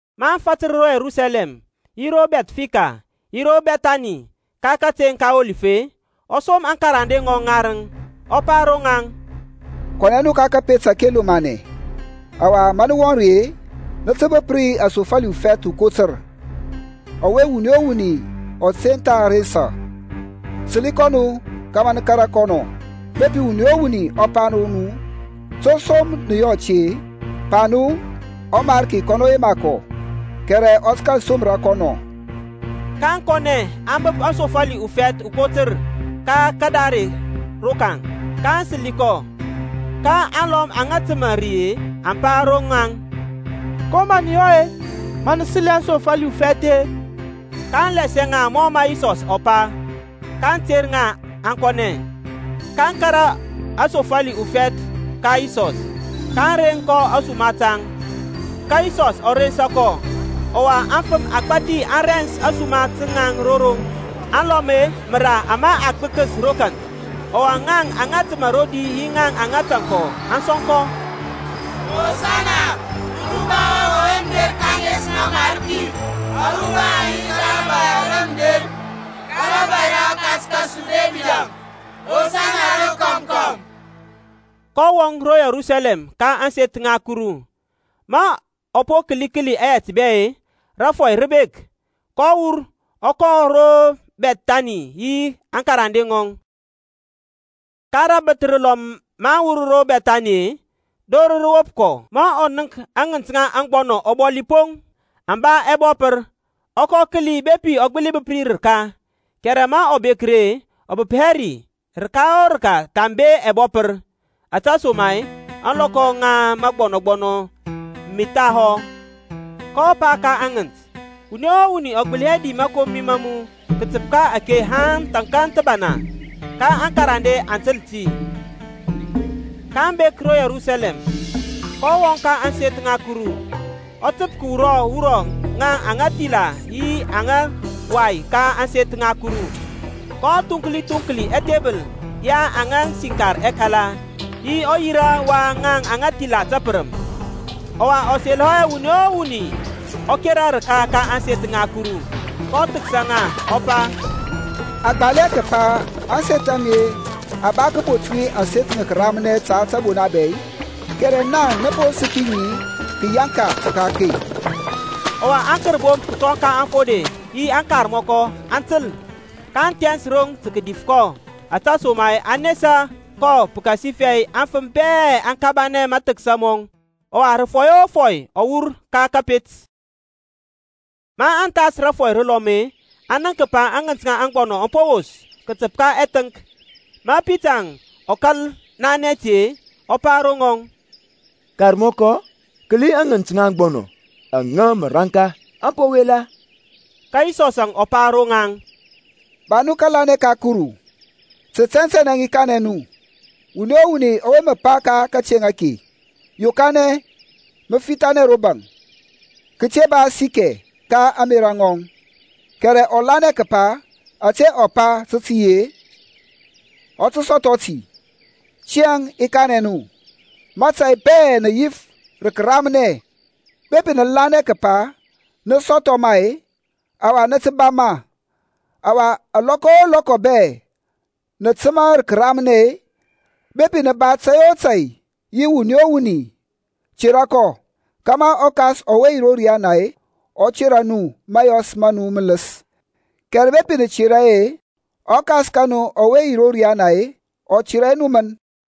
Maŋ fatər ro Yerusalɛm yi ro Bɛthfeki yi ro Bɛthani, ka kateŋ ka Ɔlif-e, ɔ som aŋkarande ŋɔŋ ŋarəŋ, ɔ pa ro ŋaŋ, Kɔnɛ nu ka kȧpet ȧke lomanɛ, ɔwa ma nə wɔŋ ri-e, nə tə bəp ri asofali ufɛth ukotər, ɔwe wuni o wuni ɔ te tha rensa. Səli kɔ nu kȧmȧ nə kȧrȧ kɔ nɔ. Bepi wuni o wuni ɔ pa ro nu, To som nə yɔ ȧte-e? Pa nu, ƆMariki kɔnɔ yema kɔ kɛrɛ ɔ tə kȧl somra kɔ nɔ. kaŋ kɔnɛ aŋ bəp aŋsofali ufɛth ukotər ka kadare rokaŋ, kaŋ səli kɔ. Ka alɔm aŋa təmȧ ri-e aŋ pa ro ŋaŋ, Ko mə nə yɔ-e ma nə səli aŋsofali ufɛth-e? kaŋ lasianɛ ŋa mɔ mə Yisɔs ɔ pa; kaŋ ter ŋa aŋ kɔnɛ. kaŋ kȧrȧ aŋsofali ufɛth ka Yisɔsȧŋ, kaŋ reŋ kɔ ȧsuma taŋ; ka Yisɔsȧŋ ɔ rensa kɔ. Ɔwa afəm agbȧthi aŋ rens ȧsuma taŋ ro roŋ, aŋlɔm-e məra ama aŋ gbəkəs ro kanth. Ɔwa ŋaŋ aŋa təmȧ rodi yi ŋaŋ aŋa tȧŋ aŋ sɔŋkɔ, Hosana, uruba wɔŋ ɔwe mə der ka ȧŋes ŋa ɔMarki; aruba aŋ yi ka rȧbȧy ara mə derȧŋ, rȧbȧy ra ɔkas kȧsu Debidȧŋ. Hosana rokɔm kɔm. kɔ wɔŋ ro Yerusalɛm ka ȧŋseth ŋa Kuru. Ma ɔ po kəli kəli ɛyɛt bɛ-e, rȧfɔy rə bek, kɔ wur ɔ kɔnɛ ro Bɛthani yi aŋkarande ŋɔŋ. Ka rəbəth rəlɔm maŋ wur ro Bɛthani-e, dor rə wop kɔ. Ma ɔ nənk aŋənt ŋa agbɔnɔ ɔbɔli poŋ, aŋ ba ɛbɔpər, ɔ kɔ kəli bepi ɔ gbəli bəp ri rəka; kɛrɛ ma ɔ bek ri-e, ɔ bəp hɛ rəka o rəka thambe ɛbɔpər. Ȧtesoma-e, ȧŋlɔkɔ ŋa məgbɔnɔ me thahɔ. kɔ pa ka aŋənt, Wuni o wuni ɔ di hɛ sɔ məkomi ma mu kətəp ka ȧŋlɔkɔ aŋe haŋ thȧnkȧŋ thəbana. Ka aŋkarande ŋɔŋ aŋ təl ti. kaŋ bek ro Yerusalɛm, kɔ wɔŋ ka ȧŋseth ŋa Kuru, ɔ təp kəwura wurɔ ŋaŋ aŋa thila yi aŋa wai ka ȧŋseth ŋa Kuru, kɔ thuŋkli thuŋkli ɛthebəl ya aŋa siŋkar ɛkala, yi ɔyira wa aŋa thila təpərəm. Ɔwa ɔ selɔ hɛ wuni o wuni ɔ kera rəka ka ȧŋseth ŋa Kuru. kɔ thəksa ŋa, ɔ pa, A gbal hɛ kəpa, Ȧŋseth a mi-e a ba kəbont ŋi ȧŋseth ŋa kəramnɛ ta tȧbona bɛ-i? Kɛrɛ naŋ nə po səki ŋi kəyaŋka ka akey. Ɔwa aŋkərbomp kətɔŋ ka aŋfode yi aŋkarmɔkɔ aŋ təl, kaŋ thɛns roŋ tə kədif kɔ, ȧtesoma-e aŋ nesa kɔ pəkasifɛ aŋfəm bɛ aŋ kabanɛ mathəksa mɔŋ. Ɔwa rəfɔi o rəfɔi ɔ wur ka kȧpet. Maŋ thas rəbəth rəlɔm-e, aŋ nənk kəpa aŋənt ŋa aŋgbɔnɔ aŋ po wos kətəp ka ɛthəŋk. Ma Pitaŋ ɔ kȧl nanɛ ti-e, ɔ pa ro ŋɔŋ, Karmɔkɔ, kəli aŋənt ŋa aŋgbɔnɔ aŋa mə raŋka aŋ po wela. Ka Yisɔsȧŋ ɔ pa ro ŋaŋ, Ba nu kȧlanɛ ka Kuru. Tə tɛntɛnɛ i kanɛ nu, Wuni o wuni ɔwe mə pa ka kateŋ ake, Yokanɛ, mə fithanɛ ro baŋ, kəte ba asikɛ ka ȧŋmerȧ ŋɔŋ, kɛrɛ ɔ lanɛ kəpa ȧte ɔ pa tə tə yi-e, ɔ tə sɔthɔ ti. Tiyȧŋ i kanɛ nu, mȧtȧy bɛ nə yif rə kəramnɛ, bepi nə lanɛ kəpa nə sɔthɔ ma-e, ɔwa nə tə ba ma. Ɔwa alɔkɔ o lɔkɔ bɛ nə təmȧ rə kəramnɛ-e, bepi nə ba tȧy o tȧy yi wuni, tera kɔ; kȧmȧ ɔKas ɔwe yi ro riyana ɔ tera nu mȧyɔs ma nu mələs. Kɛrɛ bepi nə tera hɛ, ɔKas ka nu ɔwe yi ro riana-e, ɔ tera hɛ nu mən.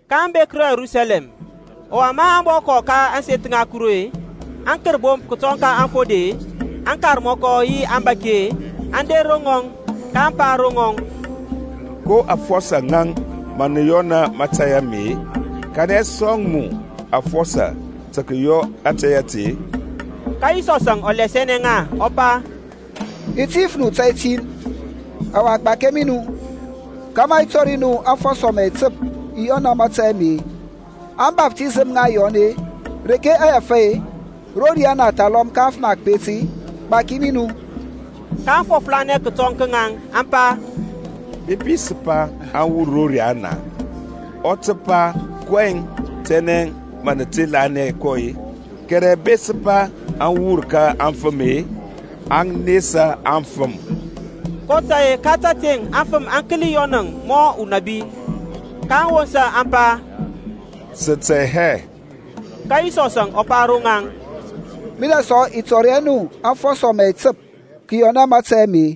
kaŋ bek ro Yerusalɛm; ɔwa ma ɔ bɔ kɔth ka ȧŋseth ŋa Kuru-e, aŋkərbomp kətɔŋ ka aŋfode-e, aŋkarmɔkɔ yi aŋbȧki-e, aŋ der ro ŋɔŋ; kaŋ pa ro ŋɔŋ, Ko afɔsɔ ŋaŋ mə yɔna mȧtȧy ame-e? Kanɛ sɔŋ mu aŋfɔsɔ tə kəyɔ ȧtȧy ȧte-e? Ka Yisɔsȧŋ ɔ lasianɛ ŋa, ɔ pa, I ti yif nu tȧy tin, ɔwa gbakia mi nu, kȧmȧ i tɔri nu aŋfɔsɔ mə i təp i yɔna mȧtȧy ame. Ȧŋbaftisəm ŋa Yɔn-e, reke aŋ wur-e? Ro riyana, thalɔm ka afəm a kəpet-e? Gbakɛ mi nu. kaŋ fɔflanɛ kətɔŋ ka ŋaŋ, aŋ pa, Bepi sə pa aŋ wur ro riana-e, ɔ tə pa, kɔyɛŋ tɛnɛ nə te lanɛ kɔ-a? Kɛrɛ bepi sə pa aŋ wur ka afəm-e aŋ nesa aŋfəm; kotȧy-e ka təteŋ aŋfəm aŋ kəli Yɔnȧŋ mɔ unabi. kaŋ wosa aŋ pa, Sə tɛ hɛ. Ka Yisɔsȧŋ ɔ pa ro ŋaŋ, Minɛ sɔ i tɔri hɛ nu aŋfɔsɔ mə i təp kəyɔna mȧtȧy ame.